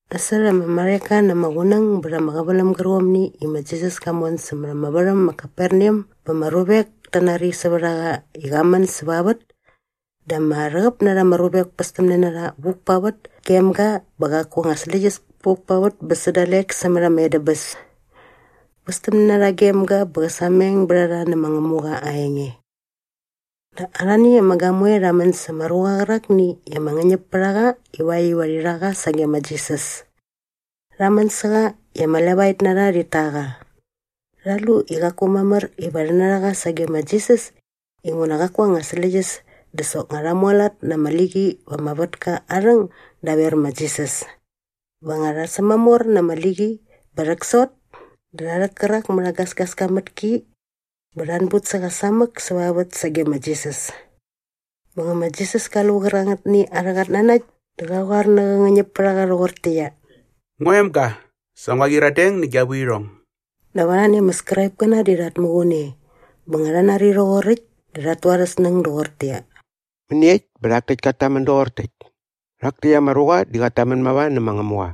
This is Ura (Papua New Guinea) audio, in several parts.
Nasot ama marheka na ama qunäng bät ama qäväläm gärqomni i ma Jisas ka mon sämät ama värhäm ma Kaperneam bä ama ruvek ta nari sävät a qa i qa män säva vät dä ama rhäqäp na rha ama ruvek pästämne na rha vuk pa vät gem ga bä qaku anga släqyäs puk pa vät bä sä dalek sämät ama edäbäs. Västämne na rha gem ga bä qä sameng bät a rha nä ma Ngämuqa aa enge. Dä arhani ama gamoe rha män sa ama ruqa qärakni i ama ngäñäp pät a qa ivakt iva rhi rha qa sage ma Jisas. Rha män sä qa i ama levaet na rha rhit ta qa. Rha lu i qaku mamär iva rhi narha qa sage ma Jisas inguna qaku anga släqyäs dä soknga rha mualat na ama liqi va ama vätka aa rhäng daver ma Jisas. Bä nga rha sämamor na ama liqi bä rhäksot dä rha rhäk kärak mät aa gasgaska mät ki bä rha anbut sä qa samäk säva vät sage ma Jisas. Bä nga ma Jisas ka lu qärangätni arhä qatnanakt dä qa qoar nä qä ngäñäpärhaqa rhoqortäqyia, “Ngua emga, sa ngua qyiradeng nä gia vuirhong.” Dap arhani ama Skraipkäna di rhat muqun e bä nga rha nari rhoqoräkt dä rhat tu arhä snäng doqortäqyia, “Mäniekt bä rhak täkt kat tamän doqor täkt? Rhak täkt ama ruqa di qat tamän mava nä ma Ngämuqa!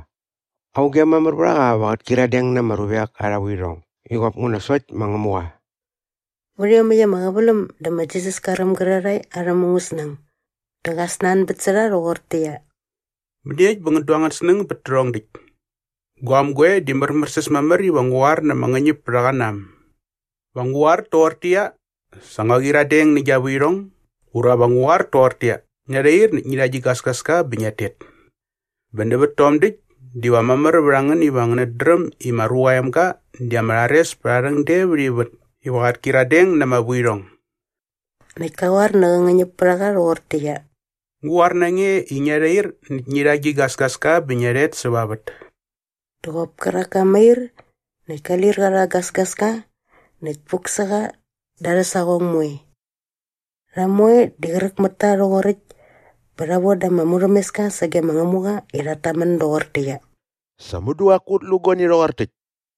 Auge mamär vät a qa iva qät kyiradeng na ama ruvek arha vuirhong i qop nguna sokt ma Ngämuqa?” Vät iomäkt ama qäväläm dä ma Jisas ka räm gärarhae arhä mungäsnäng dä qa snanbät sä rha rhoqortäqyia, “Mäniekt bä ngän du angän snäng bät tärhong däkt? Guaäm goe di märmärsäs mamär iva ngu qoar na ama ngäñäpärhaqa na äm? Va ngu qoar toqortäqyia, ‘Sa ngua qyiradeng nä gia vuirhong’ ura va ngu qoar toqortäqyia, ‘Ngia rhair näkt ngi rha gi gasgaska bä ngiat tet’? Bä nävät tom däkt diva mamär vät a ngän iva ngänät dräm i ma Ruqa aa Emga di ama rhares pät aa rhäng de vät ivät iva qät kyiradeng na ama vuirhong.” Näkt ka qoar nä qä ngäñäpärhaqa rhoqortäqyia, “Ngu qoar na nge i ngia rhair näkt ngi rha gi gasgaska bä ngia rhet säva vät.” Dä qop kärak ka mair näkt ka lir qa rha aa gasgaska näkt puk sä qa da arhä saqong moe. Rha moe di qräk mät ta rhoqoräkt bä rha voda ama murhämeska sage ma Ngämuqa i rhat tamän doqortäqyia, “Sa mudu qaku ut lu guani rhoqor täkt!”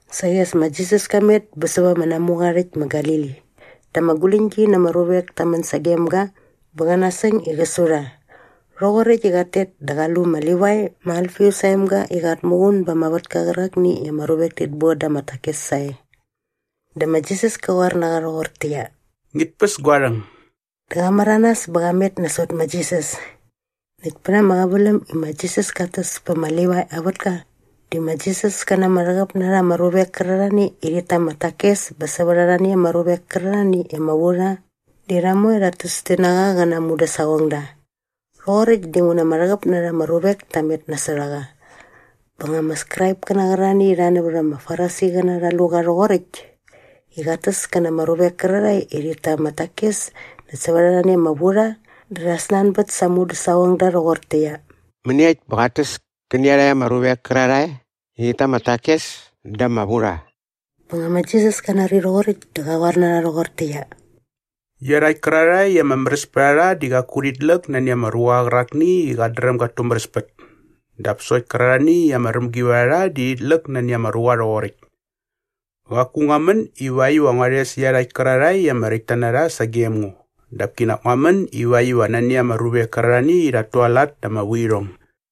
Saqi as ma Jisas ka met bä sävät ama namuqa aa rhäkt ma Galili dä ama guläñgi na ama ruvek ta män sagem ga bä qä nasäng i qä su rha. Rhoqoräkt i qat tet dä qa lu ma Livai ma Alfius aa emga i qat muqun ba ama vätka qärakni i ama ruvek tit boda ama takes sae. Dä ma Jisas ka qoar na qa rhoqortäqyia, “Ngit päs gua rhäng.” Dä qa märanas bä qa met nasot ma Jisas. Näkt pät ama qäväläm i ma Jisas kat täs pä ma Livai aa vätka di ma Jisas kä na ama rhäqäp na rha ama ruvek kärarhani i rhit ta ama takes bä sävät arhani ama ruvek kärarhani i ama vu rha di rha moe rhat täs ti na qa qä na aa mudäsaqongda. Rhoqoräkt dinguna ama rhäqäp na rha ama ruvek ta met nasot a qa. Bä nga ama Skraipkäna qärarhani i rha nävät ama Farisiqäna rha lu qa rhoqoräkt i qat täs kä na ama ruvek kärarhae i rhit ta ama takes näkt sävät arhani ama vurha dä rha snanbät sa aa mudäsaqongda rhoqortäqyia, “Mäniekt bä qat täs kä nä iarhakt ama ruvek kärarhae i rhit ta ama takes dä ama vurha?” Bä nga ma Jisas ka nari rhoqoräkt dä qa qoar na rha rhoqortäqyia, “Iarhakt kärarhae i ama märäs pät a rha di qaku rhit läk nani ama ruqa qärakni i qat dräm gat tumäräspät dap sokt kärarhani i ama rämgi vät a rha di rhit läk nani ama ruqa rhoqoräkt. Qaku ngua män ivakt iva ngua rhes iarhakt kärarhae i ama räktta na rha sagem ngo dap kinak ngua män ivakt iva nani ama ruvek kärarhani i rhat tualat na ama vuirhong.”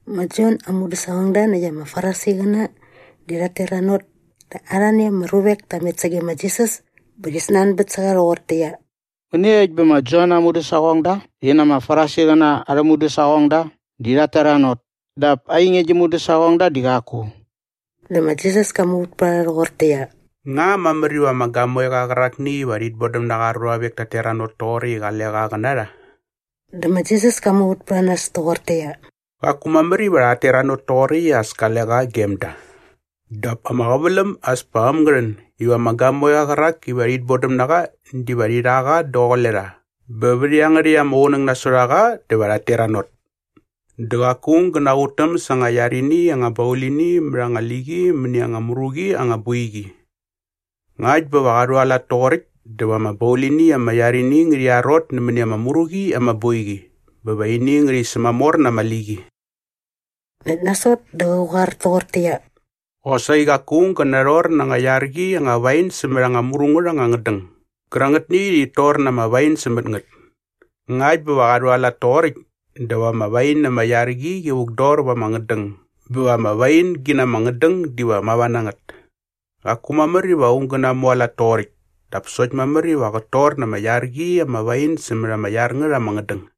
Ma Jon aa mudäsaqongda näkt ama Farisiqäna di rhat teranot dä arhani ama ruvek ta met sage ma Jisas bä rhi snanbät sä qa rhoqortäqyia, “Mäniekt bä ma Jon aa mudäsaqongda rhi na ama Farisiqäna arhä mudäsaqongda di rhat teranot dap ainge gi mudäsaqongda di qaku?” Dä ma Jisas ka muvät pät a rha rhoqortäqyia, “Nga mamär iva ama gamoeqa qärakni iva rhit bodäm na qa aa ruavek tat teranot toqoräkt i qale qa qä na rha?” Dä ma Jisas ka muvät pät a nas toqortäqyia, “Qaku mamär iva rhat teranot toqoräkt i as kale qa gem da.” Dap ama qäväläm as pa äm ngä rhän iva ama gamoeqa qärak iva rhit bodäm na qa diva rhi rha qa daqule rha bä vät iangärhäkt ama qunäng nasot a qa dä va rhat teranot. Dä qaku aung gä naqutäm sa anga iar ini anga baulini mät anga liqi mäni anga mru qi anga boiqi. Ngakt bä va qa rhualat toqoräkt dä va ama baulini ama iar ini ngärhi arot nämäni ama mru qi ama boiqi bä va ini ngärhi sämamor na ama liqi. Näkt nasot dä qä qoar toqortäqyia, “Qosaqi qaku aung gä narhor na anga iar qi anga wain sämät anga mru ngät anga ngädäng gärangätni i rhit tor na ama wain sämät ngät. Ngakt bä va qa rhualat toqoräkt dä va ama wain ama iar qi qi vukdor va ama ngädäng bä va ama wain gi na ama ngädäng diva mava na ngät. Qaku mamär iva aung gä namualat toqoräkt dap sokt mamär iva qät tor na ama iar qi ama wain sämät ama iar ngät ama ngädäng.”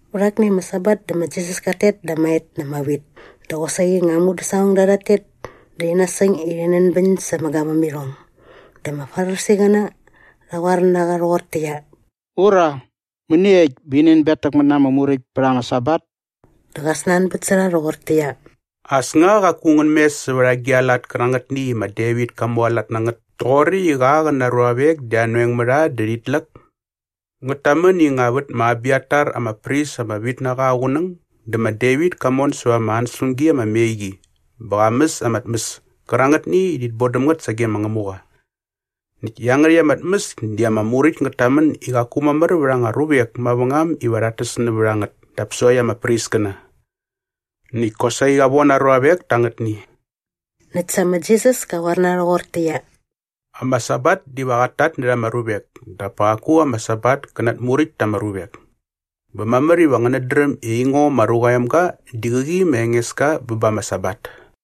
Vät akni ama Sabat dä ma Jisas kat tet da ama et na ama wit dä qosaqi nga aa mudäsaqongda rhat tet dä rhi nasäng i rhi nänbäñ sa ama gavämirhong. Dä ama Farisiqäna rha qoar na qa rhoqortäqyia, “Ura, mäniekt bä rhi nänbetäkmät na ama Muräkt pät ama Sabat?” Dä qa snanbät sä rha rhoqortäqyia, “As nga qaku ngän mes sävät agi a lat kärangätni i ma Devit ka mualat na ngät toqoräkt i qa qä na aa ruavek di anoeng mä rha dä rhit läk? Ngät tamän i nga vät ma Abiatar ama pris ama vit na qa aa qunäng dä ma Devit ka mon säva ama ansäspämgi ama me qi bä qa mäs ama tmäs kärangätni i rhit bodäm ngät sage ma Ngämuqa. Näkt iangärhäkt ama tmäs di ama Muräkt ngät tamän i qaku mamär vät anga ruvek mavängam iva rhat täs nävät a ngät dap sokt ama priskäna. Näkt kosaqi qa von aa ruavek ta angätni.” Näkt sa ma Jisas ka qoar na rha rhoqortäqyia, “Ama Sabat diva qat tatnärha ama ruvek dap pa qaku ama Sabat kä natmuräkt ta ama ruvek. Bä mamär iva ngänät dräm i aingo ma Ruqa aa Emga di qäqi ma Engeska bä ba ama Sabat.”